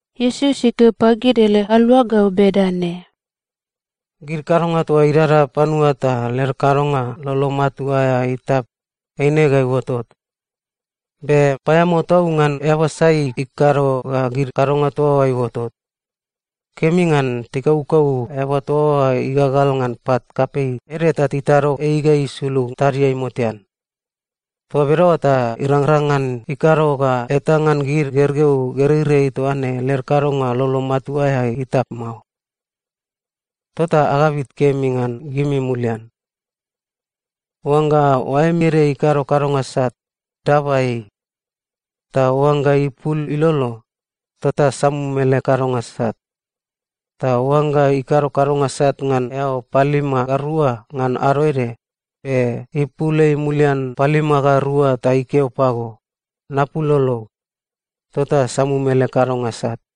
Iesus ikeo pagid ele aluagau bedane, “Gid kadonga toa idada panua ta led kadonga lolo matua aea itap, eine ga iuotot. Be paeamao tau ngan eaba sai ikado ga gid kadonga toa oa iuotot. Kemi ngan tikaukau eaba toa oa igagal ngan pat kapei ede ta titado ei ga isulug tadiai motean. Toa bedaoa ta irangrang ngan ikado ga eta ngan gid gergeu gereirei toa ne led kadonga lolo matua aea itap mao. Tota agabit kemi ngan gimi mulian. “Oangga oaem ede ikado kadonga sat, daba ei. Ta oangga ipul ilolo, tota samum ele kadonga sat. Ta oangga ikado kadonga sat ngan eao palima ga rua ngan ado ede, be ipul ei mulian palima ga rua ta ikeo pago, ‘Napul lolog,’ tota samum ele kadonga sat.”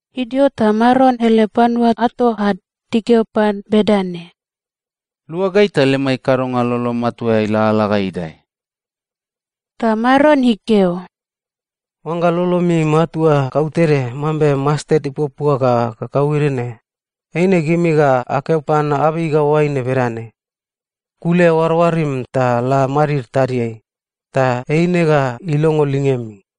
Idio ta Maron ele panua ato ad tikeo pan bedane, “Lua gai ta lemai kadonga lolo matua aea ilalala ga idae.” Ta Maron ikeo, “Oangga lolomi matua kautede mambe mastet ipuapua ga kakauede ne, eine gimi ga akeo pan abei ga oaine bedane, ‘Kule oaroarim ta la madid tadiai,’ ta eine ga ilongo lingemi.”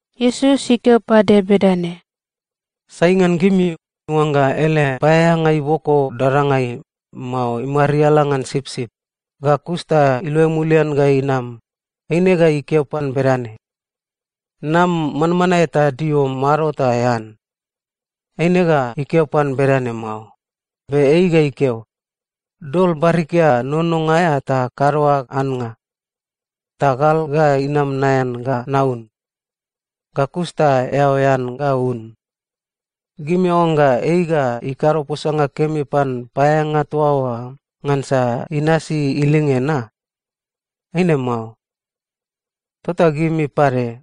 Iesus ikeo pade bedane, “Sai ngan gimi, oangga ele paeaeanga iboko dadangai, mao imariala ngan sipsip, ga kus ta iluai mulian ga inam, eine ga ikeo pan bedane, ‘Nam manmanae ta dio mado ta ean’? Eine ga ikeo pan bedane mao. Be ei ga ikeo, ‘Dol barikia nononga aea ta kado ag annga. Ta gal ga inam naean ga naun. Ga kus ta eao ean ga un.’ Gimi aoangga ei ga ikado posanga kemi pan paeaeanga toa oa ngansa inasi ilinge na? Eine mao. Tota gimi pade,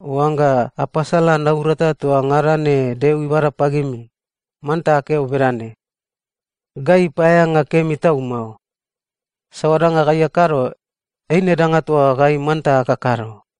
oangga apasala naurata toa ngada ne Deo ibada pagimi, manta akeo bedane, ‘Gai paeaeanga kemi tau mao. Saoa danga gai akado, eine danga toa gai manta akakado.’”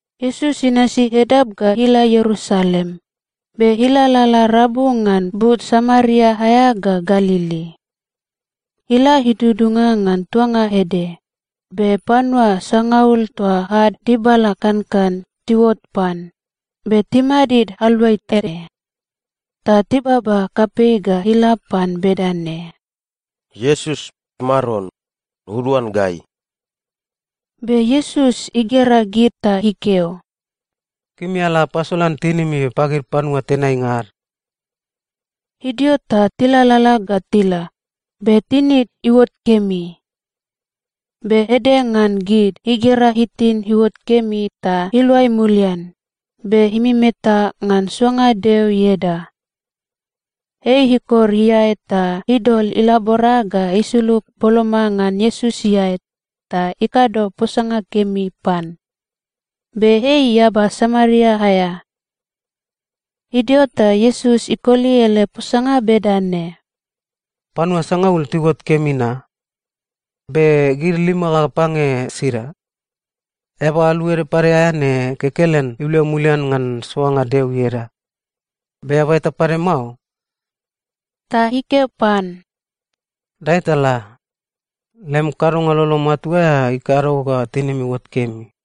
Iesus inasi edap ga ila Ierusalem, be ilalala rabu ngan but Samaria aea ga Galili. Ila idudunga ngan tuanga ede, be panua sangaul toa ad dibala kankan tiuot pan, be timadid aluai tede. Ta tibaba kapei ga ila pan bedane, “Iesus, Maron, uduan gai!” Be Iesus igera gid ta ikeo, “Gimi ala apasolan tinimi pagid panua tenainga ad.” Idio ta tilalala ga tila, be tinid iuot kemi. Be ede ngan gid igera itin iuot kemi ta iluai mulian, be imemetae ngan soanga Deo ieda. Ei ikor iae ta idol ilabora ga isulug boloma ngan Iesus iae ta ikado posanga kemi pan. Be ei eaba Samaria aea. Idio ta Iesus ikoli ele posanga bedane, “Panua sangaul tiuot kemi na? Be gid lima ga pange sida? Eaba alu ede pade aea ne kekelen iluai mulian ngan soanga Deo ieda, be eaba eta pade mao?” Ta ikeo pan, “Dae ta la. Lem kadonga lolo matua aea ikado ga tinim iuot kemi.”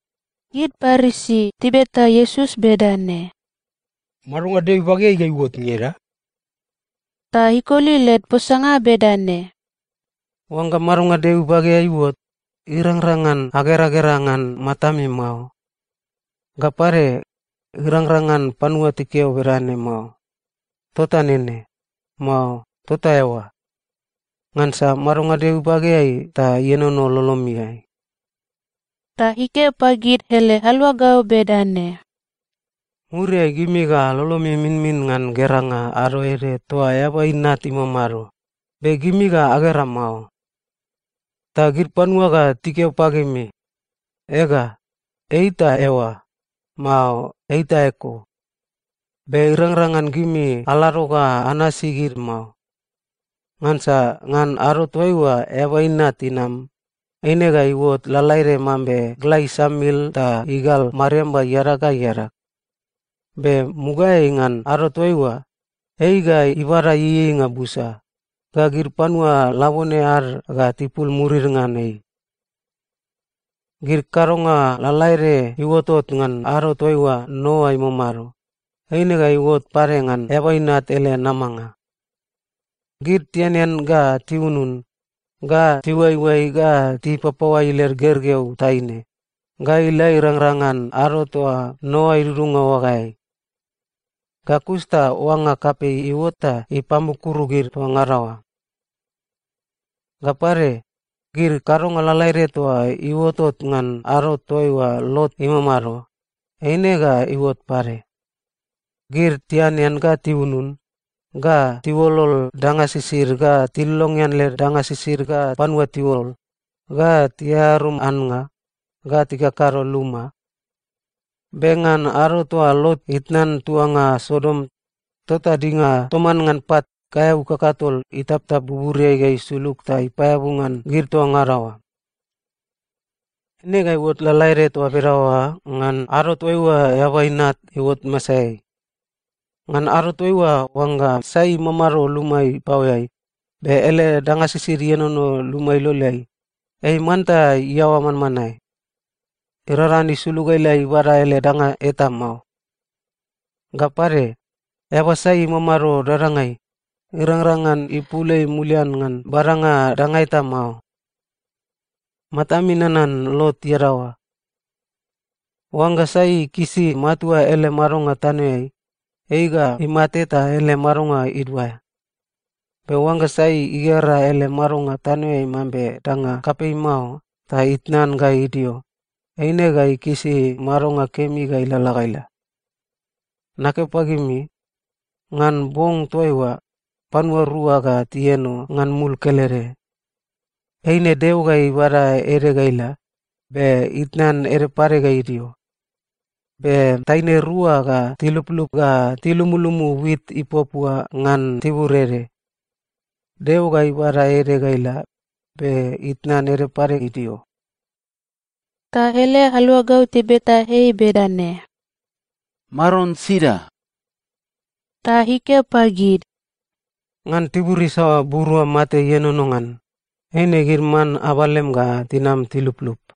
Gid Parisi tibeta Iesus bedane, “Madonga Deo ibageai ga iuot ngeda?” Ta ikoli led posanga bedane, “Oangga madonga Deo ibageai iuot, irangrang ngan ageragera ngan matami mao. Ga pade, irangrang ngan panua tikeo bedane mao, ‘Tota nene,’ mao ‘Tota eoa,’ ngansa madonga Deo ibageai ta ienono lolomiai.” Ta ikeo pagid ele aluagau bedane, “Muriai gimi ga lolomi iminmin ngan geranga ado ede toa Eaba Inat imamado, be gimi ga agera mao. Ta gid panua ga tikeo pagimi, ‘Ega, ei ta eoa,’ mao ‘Ei ta eko.’ Be irangrang ngan gimi alado ga anasi gid mao. Ngansa ngan ado toaiua Eaba Inat inam, eine ga iuot lalaede mambe gla isamil ta igal mariamba iadag ga iadag. Be mugaeai ngan ado toaiua, ei ga ibada ieieinga busa, ga gid panua labone ad ga tipul murid ngan ei. “Gid kadonga lalaede iuotot ngan ado toaiua Noa imamado, eine ga iuot pade ngan Eaba Inat ele namanga. Gid tianean, ga tiunun, ga tiuaioai, ga tipapaoai led gergeu taine, ga ila irangrang ngan ado toa Noa idudunga oagaeai. Ga kus ta oanga kapei iuot ta ipamukuru gid toa ngada oa. “Ga pade, gid kadonga lalaede toa iuotot ngan ado toaiua Lot imamado, eine ga iuot pade. Gid tianean, ga tiunun, ga tiuolol danga sisid, ga tilongean led danga sisid ga panua tiuol, ga tiarum annga, ga tikakado luma. Be ngan ado toa Lot itnan tuanga Sodom, tota dinga toman ngan pat kaeau kakatol itaptap buburiai ga isulug ta ipaeabu ngan gid toa ngada oa. “Eine ga iuot lalaede toa bedaoa ngan ado toaiua Eaba Inat iuot masaeai. Ngan ado toaiua, oangga sai imamado luma ipaoeai, be ele danga sisid ienono luma iloleai, ei manta iaoa manmanae. Irangrang ngan isulug ga ila ibada ele danga eta mao. Ga pade, eaba sai imamado dadangai, irangrang ngan ipul ei mulian ngan badanga danga eta mao. Matami nanan Lot iadaoa! Oangga sai ikisi matua ele madonga tanoeai, ei ga imate ta ele madonga iduaea. Be oangga sai igera ele madonga tanoeai mambe danga kapei mao ta itnan ga idio, eine ga ikisi madonga kemi ga ilalala ga ila. Nakeo pagimi, ngan bong toaiua, panua rua ga tieno ngan mul kelede. Eine Deo ga ibada ede ga ila, be itnan ede pade ga idio. Be taine rua ga tiluplup ga tilumulumu wit ipuapua ngan tibur ede. Deo ga ibada ede ga ila, be itnan ede pade idio.” Ta ele aluagau tibeta ei bedane, “Maron, sida?” Ta ikeo pagid, “Ngan tibur isaoa burua mate ienono ngan, eine gid man abalem ga tinam tiluplup.”